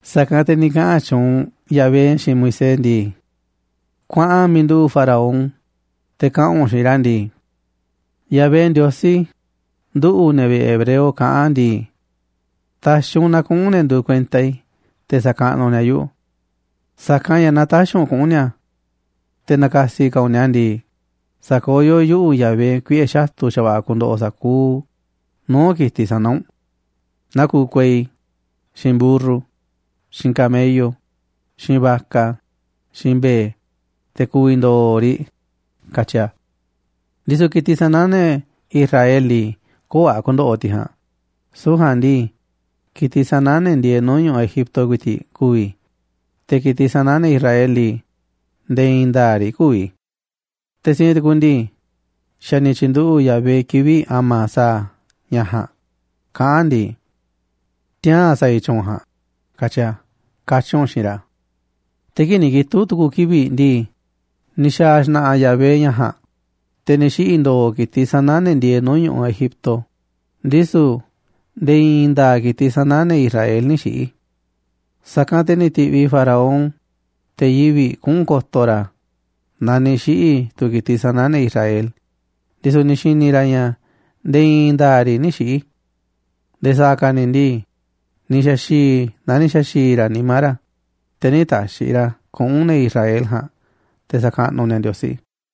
Sa̱kanꞌ te̱ ni̱ kaꞌa̱n tyuunꞌ Yahvé xiinꞌ Moisés ndii: ―Kuaꞌan miiꞌ nduꞌu̱ꞌ Faraón te̱ kaꞌa̱n u̱nꞌ xiinꞌ ra̱ ndii: “Yahvé, Ndiosí nduꞌu̱, ne̱ vi̱ꞌe̱ hebreo, kaꞌán ndii: ‘Ta̱xi̱ u̱nꞌ na kuꞌu̱n ne̱ nduuꞌ kuenta i̱ te̱ sa̱kaꞌnuꞌ ni̱a̱ yuꞌu̱. Sa̱kanꞌ ña̱ naaꞌ tä̱xi̱ u̱nꞌ kuꞌu̱n ni̱a̱, te̱ na̱ka̱si̱ ka̱ u̱nꞌ ni̱a̱ ndii, sa̱koyó yuꞌu̱, Yahvé, kuiꞌe̱ xatu̱ xa̱va̱ꞌa̱ ku̱ndo̱ꞌo̱ sa̱kuuꞌ nuu̱ꞌ ki̱tiꞌ sana̱ u̱nꞌ, naa kuuꞌ kuei, xiinꞌ mburru, xiinꞌ camello, xiinꞌ vaca, xiinꞌ mbe̱e̱, te̱ ku̱vi̱ ndo̱o̱ riꞌ, katyi a̱. Ndisu̱ ki̱tiꞌ sana̱ ne̱ Israel ndii, köo̱ꞌ a̱ ku̱ndo̱ꞌo̱ tiꞌ ja̱a̱nꞌ, süu̱ꞌ ja̱a̱nꞌ ndii, ki̱tiꞌ sana̱ ne̱ ndieeꞌ nuu̱ꞌ ñu̱ꞌuꞌ Egipto ku̱i̱ti̱ꞌ ku̱vi̱, te̱ ki̱tiꞌ sana̱ ne̱ Israel ndii, nde̱e̱ i̱i̱n nda̱a̱ꞌ riꞌ kü̱vi̱. Te̱ siinꞌ tu̱ku̱ ndii, xa̱ ni̱ tyi̱nduꞌu̱ꞌ Yahvé kivi̱ꞌ a̱ma̱ sa̱a̱ a̱ ña̱ ja̱a̱nꞌ, kaꞌán a̱ ndii: Tiaa̱n sa̱a̱ i̱ tyu̱u̱n ja̱a̱nꞌ, katyi a̱’” ―katyi̱ u̱nꞌ xiinꞌ ra̱. Te̱ kii̱ꞌ ni̱ kitu̱ꞌ tu̱ku̱ kivi̱ꞌ ndii, ni̱ xa̱a̱ xna̱ꞌa̱ Yahvé ña̱ ja̱a̱nꞌ, te̱ ni̱ xiꞌi̱ ndo̱o̱ ki̱tiꞌ sana̱ ne̱ ndieeꞌ nuu̱ꞌ ñu̱ꞌuꞌ Egipto, ndisu̱ nde̱e̱ i̱i̱n nda̱a̱ꞌ ki̱tiꞌ sana̱ ne̱ Israel nï̱ xiꞌi̱. Sa̱kanꞌ te̱ ni̱ ti̱ꞌviꞌ Faraón te̱ yivi̱ꞌ kuꞌu̱n ko̱to̱ ra̱ naaꞌ ni̱ xiꞌi̱ tu̱ ki̱tiꞌ sana̱ ne̱ Israel, ndisu̱ ni̱ xi̱ni̱ ra̱ ña̱ nde̱e̱ i̱i̱n nda̱a̱ꞌ riꞌ nï̱ xiꞌi̱. Nde̱e̱ sa̱a̱ ka̱ ni̱ ndii, ni̱ xa̱xi̱i̱ naa ni̱ xa̱xi̱i̱ ra̱ nimá ra̱, te̱ nï̱ ta̱xi̱ ra̱ kuꞌu̱n ne̱ Israel ja̱a̱nꞌ te̱ sa̱kaꞌnuꞌ ni̱a̱ Ndiosí.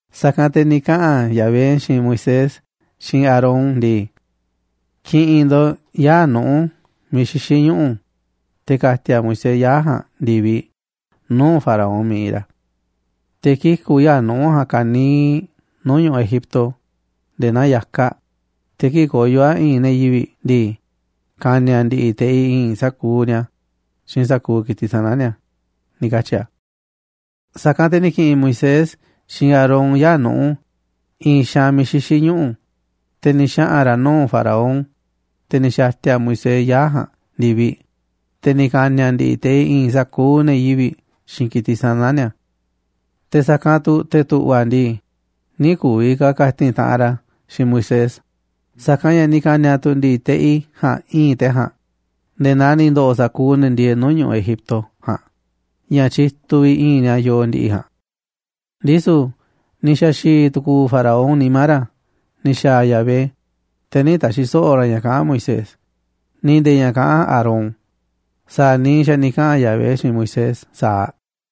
Sa̱kanꞌ te̱ ni̱ kaꞌa̱n Yahvé xiinꞌ Moisés xiinꞌ Aarón ndii: ―Ki̱ꞌi̱n ndo̱ꞌ yaa̱ꞌ nuꞌu̱ miiꞌ xixí ñuꞌu̱, te̱ ka̱ti̱a̱ Moisés yaa̱ꞌ ja̱a̱nꞌ ndi̱viꞌ nuu̱ꞌ Faraón miiꞌ iinꞌ ra̱. Te̱ kiku̱ yaa̱ꞌ nuꞌu̱ ja̱a̱nꞌ ka̱niiꞌ nuu̱ꞌ ñu̱ꞌuꞌ Egipto nde̱e̱ naa ya̱kaꞌ, te̱ kii̱ꞌ koyo̱ a̱ i̱i̱nꞌ ne̱ yivi̱ꞌ ndii, ka̱ni̱a̱ ndi̱ꞌi̱ teꞌi i̱i̱nꞌ sa̱kuuꞌ ni̱a̱ xiinꞌ sa̱kuuꞌ ki̱tiꞌ sana̱ ni̱a̱ ―ni̱ katyi̱ a̱. Sa̱kanꞌ te̱ ni̱ ki̱ꞌi̱n Moisés xiinꞌ Aarón yaa̱ꞌ nuꞌu̱ i̱i̱n xaanꞌ miiꞌ xixí ñuꞌu̱, te̱ ni̱ xaꞌa̱n ra̱ nuu̱ꞌ Faraón, te̱ ni̱ xa̱ti̱a̱ Moisés yaa̱ꞌ ja̱a̱nꞌ ndi̱viꞌ, te̱ ni̱ ka̱ni̱a̱ ndi̱ꞌi̱ teꞌi i̱i̱nꞌ sa̱kuuꞌ ne̱ yivi̱ꞌ xiinꞌ ki̱tiꞌ sana̱ ni̱a̱. Te̱ sa̱kanꞌ tu̱ te̱ tu̱ꞌva̱ ndii, nï̱ ku̱vi̱ ka̱ ka̱ti̱n taꞌanꞌ ra̱ xiinꞌ Moisés, sa̱kanꞌ ña̱ ni̱ ka̱ni̱a̱ tu̱ ndi̱ꞌi̱ teꞌi ja̱a̱nꞌ i̱i̱nꞌ te̱ ja̱a̱nꞌ, nde̱e̱ naa ni̱ ndo̱ꞌo̱ sa̱kuuꞌ ne̱ ndieeꞌ nuu̱ꞌ ñu̱ꞌuꞌ Egipto ja̱a̱nꞌ ña̱ tyituꞌ vi̱ꞌ i̱i̱nꞌ ni̱a̱ yoo ndi̱ꞌi̱ ja̱a̱nꞌ. Ndisu̱ ni̱ xa̱xi̱i̱ tu̱ku̱u̱ Faraón nimá ra̱ ni̱ xa̱a̱ Yahvé, te̱ nï̱ ta̱xi̱ so̱ꞌo̱ ra̱ ña̱ kaꞌán Moisés, ni̱ nde̱e̱ ña̱ kaꞌán Aarón sa̱a̱ niiꞌ xa̱ ni̱ kaꞌa̱n Yahvé xiinꞌ Moisés sa̱aꞌ.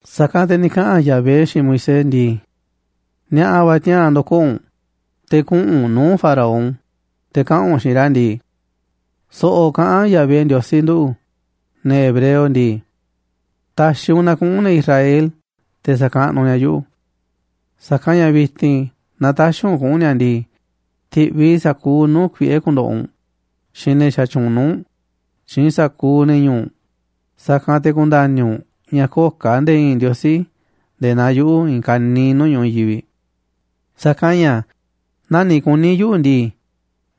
Sa̱kanꞌ te̱ ni̱ kaꞌa̱n Yahvé xiinꞌ Moisés ndii: ―Ni̱a̱ꞌa̱ va̱ tiaa̱n ndo̱koo̱ u̱nꞌ, te̱ kuꞌu̱n u̱nꞌ nuu̱ꞌ Faraón, te̱ kaꞌa̱n u̱nꞌ xiinꞌ ra̱ ndii: “So̱ꞌo̱ kaꞌán Yahvé, Ndiosí, nduꞌu̱ ne̱ hebreo, ndii: ‘Ta̱xi̱ un na kuꞌu̱n ne̱ Israel te̱ sa̱kaꞌnuꞌ ni̱a̱ yuꞌu̱. Sa̱kanꞌ ña̱ vi̱ti̱n naaꞌ tä̱xi̱ u̱nꞌ kuꞌu̱n ni̱a̱ ndii, ti̱ꞌviꞌ i̱ sa̱kuuꞌ nuu̱ꞌ kuiꞌe̱ ku̱ndo̱ꞌo̱ u̱nꞌ, xiinꞌ ne̱ xatyuunꞌ nuu̱ꞌ u̱nꞌ, xiinꞌ sa̱kuuꞌ ne̱ ñu̱u̱ u̱nꞌ, sa̱kanꞌ te̱ ku̱nda̱ni̱ u̱nꞌ ña̱ köo̱ꞌ ka̱ nde̱e̱ i̱i̱n Ndiosí nde̱e̱ naa yuꞌu̱ i̱i̱n ka̱niiꞌ nuu̱ꞌ ñu̱ꞌuꞌ i̱i̱n yivi̱ꞌ. Sa̱kanꞌ ña̱ naaꞌ ni̱ kuní yuꞌu̱ ndii,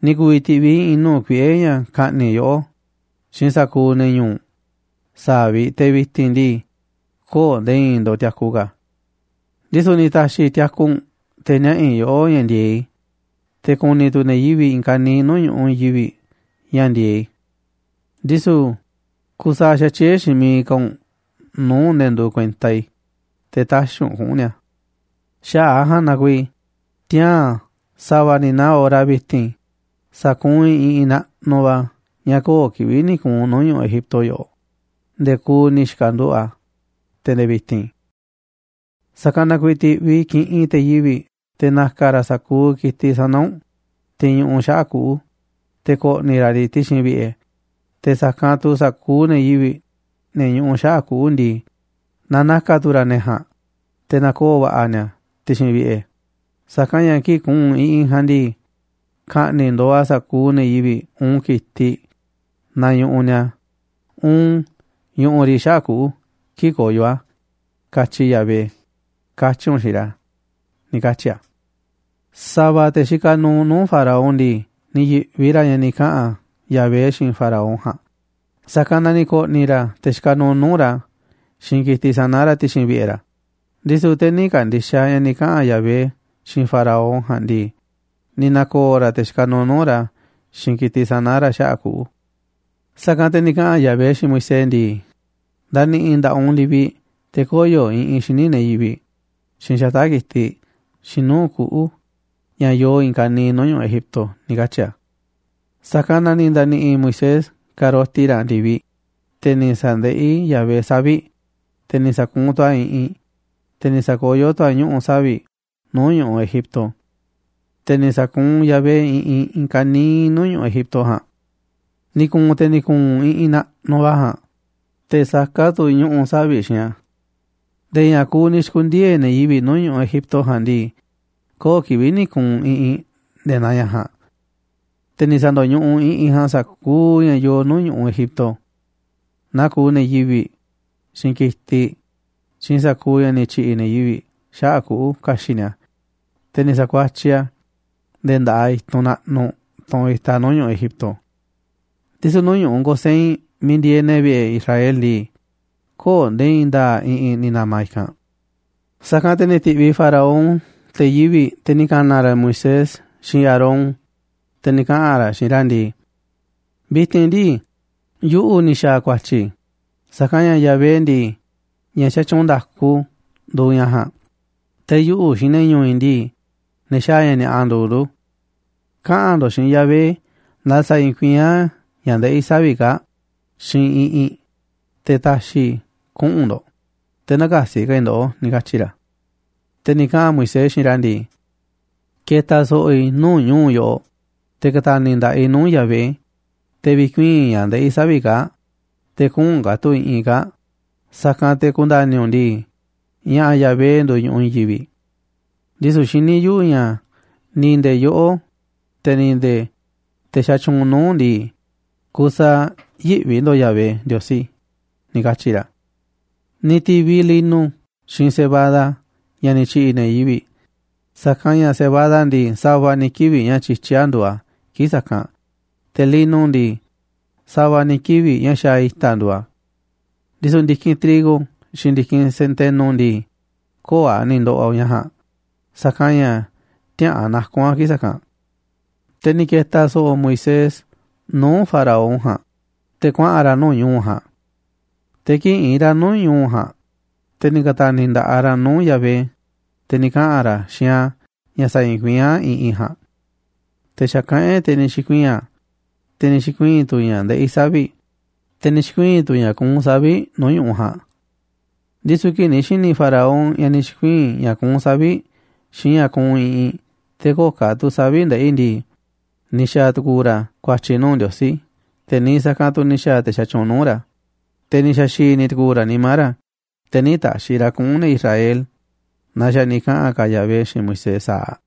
ni̱ ku̱vi̱ ti̱ꞌviꞌ i̱ i̱i̱n nuu̱ꞌ kuiꞌe̱ ña̱ ka̱ꞌni̱ꞌ yoꞌó xiinꞌ sa̱kuuꞌ ne̱ ñu̱u̱ u̱nꞌ sa̱aꞌ vi̱ꞌ te̱ vi̱ti̱n ndii, köo̱ꞌ nde̱e̱ i̱i̱n ndo̱ꞌ tiaku ka̱. Ndisu̱ ni̱ ta̱xi̱ i̱ tiaku u̱nꞌ te̱ niaꞌa̱ i̱ yoꞌó ña̱ ndi̱e̱eꞌ i̱, te̱ ku̱ni̱ tu̱ ne̱ yivi̱ꞌ i̱i̱n ka̱niiꞌ nuu̱ꞌ ñu̱ꞌuꞌ i̱i̱n yivi̱ꞌ ña̱ ndi̱e̱eꞌ i̱. Ndisu̱ kusaaꞌ xatyié xiinꞌ miiꞌ ka̱ u̱nꞌ nuu̱ꞌ ne̱ nduuꞌ kuenta i̱, te̱ tä̱xi̱ u̱nꞌ kuꞌu̱n ni̱a̱. Xaꞌa̱ꞌ a̱ ja̱a̱nꞌ na kuiiꞌ tiaa̱n sa̱va̱ ni̱ naa hora vi̱ti̱n, sa̱kuunꞌ i̱ iꞌinꞌ naꞌnuꞌ va̱ ña̱ köo̱ꞌ kivi̱ꞌ ni̱ ku̱u̱n nuu̱ꞌ ñu̱ꞌuꞌ Egipto yoꞌoꞌ nde̱e̱ kuuꞌ ni̱ xi̱ka̱nduꞌu̱ꞌ a̱, te̱ nde̱e̱ vi̱ti̱n. Sa̱kanꞌ na kuiiꞌ ti̱ꞌviꞌ kiꞌi̱ꞌ te̱ yivi̱ꞌ te̱ na̱ka̱ ra̱ sa̱kuuꞌ ki̱tiꞌ sana̱ u̱nꞌ, tiꞌ ñuꞌuꞌ xaꞌa̱ꞌ kuꞌu̱, te̱ ko̱ꞌni̱ ra̱ riꞌ ti̱xi̱n vi̱ꞌe̱, te̱ sa̱kanꞌ tu̱ sa̱kuuꞌ ne̱ yivi̱ꞌ, ne̱ ñuꞌuꞌ xaꞌa̱ꞌ kuꞌu̱ ndii, na na̱ka̱ tu̱ ra̱ ne̱ ja̱a̱nꞌ te̱ na̱koo̱ va̱ꞌa̱ ni̱a̱ ti̱xi̱n vi̱ꞌe̱, sa̱kanꞌ ña̱ kii̱ꞌ ku̱u̱n iꞌinꞌ ja̱a̱nꞌ ndii, ka̱ꞌni̱ꞌ ndo̱o̱ a̱ sa̱kuuꞌ ne̱ yivi̱ꞌ uun ki̱tiꞌ naaꞌ ñuꞌuꞌ ni̱a̱, uun ñuꞌuꞌ riꞌ xaꞌa̱ꞌ kuꞌu̱ kii̱ꞌ koyo̱ a̱, katyi Yahvé’”, katyi̱ u̱nꞌ xiinꞌ ra̱ ―ni̱ katyi̱ a̱. Sa̱va̱ te̱ xikaꞌ nuuꞌ nuu̱ꞌ Faraón ndii, ni̱ yi̱ꞌvi ra̱ ña̱ ni̱ kaꞌa̱n Yahvé xiinꞌ Faraón ja̱a̱nꞌ, sa̱kanꞌ na ni̱ ko̱ꞌni̱ ra̱ te̱ xikaꞌ nuuꞌ nuu̱ꞌ ra̱ xiinꞌ ki̱tiꞌ sana̱ ra̱ ti̱xi̱n vi̱ꞌe̱ ra̱. Ndisu̱ te̱ nï̱ ka̱ndi̱xaꞌ ña̱ ni̱ kaꞌa̱n Yahvé xiinꞌ Faraón ja̱a̱nꞌ ndii, ni̱ na̱ko̱o̱ ra̱ te̱ xikaꞌ nuuꞌ nuu̱ꞌ ra̱ xiinꞌ ki̱tiꞌ sana̱ ra̱ xaꞌa̱ꞌ kuꞌu̱. Sa̱kanꞌ te̱ ni̱ kaꞌa̱n Yahvé xiinꞌ Moisés ndii: ―Nda̱ni̱ꞌi̱ nda̱ꞌaꞌ u̱nꞌ ndi̱viꞌ, te̱ koyo̱ iꞌinꞌ xíniꞌ ne̱ yivi̱ꞌ, xiinꞌ xata̱ꞌ ki̱tiꞌ, xiinꞌ nuu̱ꞌ kuꞌu̱ ña̱ yoo i̱i̱n ka̱niiꞌ nuu̱ꞌ ñu̱ꞌuꞌ Egipto ―ni̱ katyi̱ a̱. Sa̱kanꞌ na ni̱ nda̱ni̱ꞌi̱ Moisés ka̱roti ra̱ ndi̱viꞌ, te̱ ni̱ sa̱ndeꞌí Yahvé savi̱ꞌ, te̱ ni̱ sa̱kuunꞌ tu̱ a̱ iꞌinꞌ, te̱ ni̱ sa̱kayó tu̱ a̱ ñuꞌu̱ savi̱ꞌ nuu̱ꞌ ñu̱ꞌuꞌ Egipto. Te̱ ni̱ sa̱kuunꞌ Yahvé iꞌinꞌ i̱i̱n ka̱niiꞌ nuu̱ꞌ ñu̱ꞌuꞌ Egipto ja̱a̱nꞌ. Ni̱ ku̱u̱n te̱ ni̱ ku̱u̱n iꞌinꞌ naꞌnuꞌ va̱ ja̱a̱nꞌ, te̱ saká tu̱ ñuꞌu̱ savi̱ꞌ xiinꞌ a̱. Nde̱e̱ ña̱ kuuꞌ ni̱ xi̱ku̱ndiee̱ ne̱ yivi̱ꞌ nuu̱ꞌ ñu̱ꞌuꞌ Egipto ja̱a̱nꞌ ndii, köo̱ꞌ kivi̱ꞌ ni̱ ku̱u̱n iꞌinꞌ nde̱e̱ naa ña̱ ja̱a̱nꞌ. Te̱ ni̱ sa̱ndo̱ñuꞌuꞌ iꞌinꞌ ja̱a̱nꞌ sa̱kuuꞌ ña̱ yoo nuu̱ꞌ ñu̱ꞌuꞌ Egipto, naa kuuꞌ ne̱ yivi̱ꞌ, xiinꞌ ki̱tiꞌ, xiinꞌ sa̱kuuꞌ ña̱ ni̱ tyi̱ꞌi̱ ne̱ yivi̱ꞌ xaꞌa̱ꞌ kuꞌu̱ ka̱xi̱ꞌ ni̱a̱, te̱ ni̱ sa̱kuatyiꞌ a̱ nde̱e̱ nda̱ꞌaꞌ i̱tunꞌ naꞌnuꞌ, tunꞌ itaꞌ nuu̱ꞌ ñu̱ꞌuꞌ Egipto. Ndisu̱ nuu̱ꞌ ñu̱ꞌuꞌ Gosén miiꞌ ndieeꞌ ne̱ vi̱ꞌe̱ Israel ndii, köo̱ꞌ nde̱e̱ i̱i̱n nda̱a̱ꞌ iꞌinꞌ ni̱ na̱ma̱ i̱kanꞌ. Sa̱kanꞌ te̱ ni̱ ti̱ꞌviꞌ Faraón te̱ yivi̱ꞌ, te̱ ni̱ ka̱na̱ ra̱ Moisés xiinꞌ Aarón, te̱ ni̱ kaꞌa̱n ra̱ xiinꞌ ra̱ ndii: ―Vi̱ti̱n ndii, yuꞌu̱ ni̱ xa̱a̱ ku̱a̱tyi̱, sa̱kanꞌ ña̱ Yahvé ndii, ña̱ xatyuunꞌ nda̱ku nduuꞌ ña̱ ja̱a̱nꞌ, te̱ yuꞌu̱ xiinꞌ ne̱ ñu̱u̱ i̱ ndii, ne̱ xaaꞌ ña̱ ni̱a̱ꞌa nduuꞌ ndu̱. Kaꞌa̱n ndo̱ꞌ xiinꞌ Yahvé na sa̱i̱i̱n kuiín a̱ ña̱ ndeꞌí savi̱ꞌ kaa̱ꞌ xiinꞌ iꞌinꞌ, te̱ ta̱xi̱ i̱ kuꞌu̱n ndo̱ꞌ, te̱ nä̱ka̱si̱ ka̱ i̱ ndoꞌó ―ni̱ katyi̱ ra̱. Te̱ ni̱ kaꞌa̱n Moisés xiinꞌ ra̱ ndii: ―Ke̱ta̱ so̱ꞌo̱ i̱ nuu̱ꞌ ñu̱u̱ yoꞌoꞌ, te̱ ka̱ta̱ni̱ nda̱ꞌaꞌ i̱ nuu̱ꞌ Yahvé, te̱ vi̱kuii̱n ña̱ ndeꞌí savi̱ꞌ kaa̱ꞌ, te̱ kü̱u̱n ka̱ tu̱ iꞌinꞌ kaa̱ꞌ, sa̱kanꞌ te̱ ku̱nda̱ni̱ u̱nꞌ ndii, ña̱ꞌa̱ Yahvé nduuꞌ ñu̱ꞌuꞌ i̱i̱n yivi̱ꞌ. Ndisu̱ xiní yuꞌu̱ ña̱ ni̱ nde̱e̱ yoꞌó, te̱ ni̱ nde̱e̱ te̱ xatyuunꞌ nuu̱ꞌ u̱nꞌ ndii, kusaaꞌ yïꞌvi ndo̱ꞌ Yahvé Ndiosí ―ni̱ katyi̱ ra̱. Ni̱ ti̱viꞌ lino xiinꞌ cebada ña̱ ni̱ tyi̱ꞌi̱ ne̱ yivi̱ꞌ, sa̱kanꞌ ña̱ cebada ndii, sa̱va̱ ni̱ kivi̱ꞌ ña̱ tyityí a̱ nduuꞌ a̱ kii̱ꞌ sa̱kanꞌ, te̱ lino ndii, sa̱va̱ ni̱ kivi̱ꞌ ña̱ xaaꞌ i̱ta̱ a̱ nduuꞌ a̱. Ndisu̱ ndi̱kinꞌ trigo xiinꞌ ndi̱kinꞌ centeno ndii, köo̱ꞌ a̱ ni̱ ndoꞌoꞌ ña̱ ja̱a̱nꞌ, sa̱kanꞌ ña̱ tiäꞌa̱an naku̱n a̱ kii̱ꞌ sa̱kanꞌ. Te̱ ni̱ ke̱ta̱ so̱ꞌo̱ Moisés nuu̱ꞌ Faraón ja̱a̱nꞌ te̱ kuaꞌa̱n ra̱ nuu̱ꞌ ñu̱u̱ ja̱a̱nꞌ. Te̱ kii̱ꞌ iinꞌ ra̱ nuu̱ꞌ ñu̱u̱ ja̱a̱nꞌ, te̱ ni̱ ka̱ta̱ni̱ nda̱ꞌaꞌ ra̱ nuu̱ꞌ Yahvé, te̱ ni̱ kaꞌa̱n ra̱ xiinꞌ a̱ ña̱ sa̱i̱i̱n kuiín a̱ iꞌinꞌ ja̱a̱nꞌ. Te̱ xa̱kaꞌán e̱ꞌ, te̱ ni̱ xi̱kuii̱n a̱, te̱ ni̱ xi̱kuii̱n tu̱ ña̱ ndeꞌí savi̱ꞌ, te̱ ni̱ xi̱kuii̱n tu̱ ña̱ kuunꞌ savi̱ꞌ nuu̱ꞌ ñu̱ꞌuꞌ ja̱a̱nꞌ. Ndisu̱ kii̱ꞌ ni̱ xi̱ni̱ Faraón ña̱ ni̱ xi̱kuii̱n ña̱ kuunꞌ savi̱ꞌ xiinꞌ ña̱ kuunꞌ iꞌinꞌ, te̱ köo̱ꞌ ka̱ tu̱ savi̱ꞌ ndeꞌí ndii, ni̱ xa̱a̱ tu̱ku̱u̱ ra̱ ku̱a̱tyi̱ nuu̱ꞌ Ndiosí, te̱ niiꞌ sa̱kanꞌ tu̱ ni̱ xa̱a̱ te̱ xatyuunꞌ nuu̱ꞌ ra̱. Te̱ ni̱ xa̱xi̱i̱ ni̱ tu̱ku̱u̱ ra̱ nimá ra̱, te̱ nï̱ ta̱xi̱ ra̱ kuꞌu̱n ne̱ Israel naa xa̱ ni̱ kaꞌa̱n ka̱ Yahvé xiinꞌ Moisés sa̱aꞌ.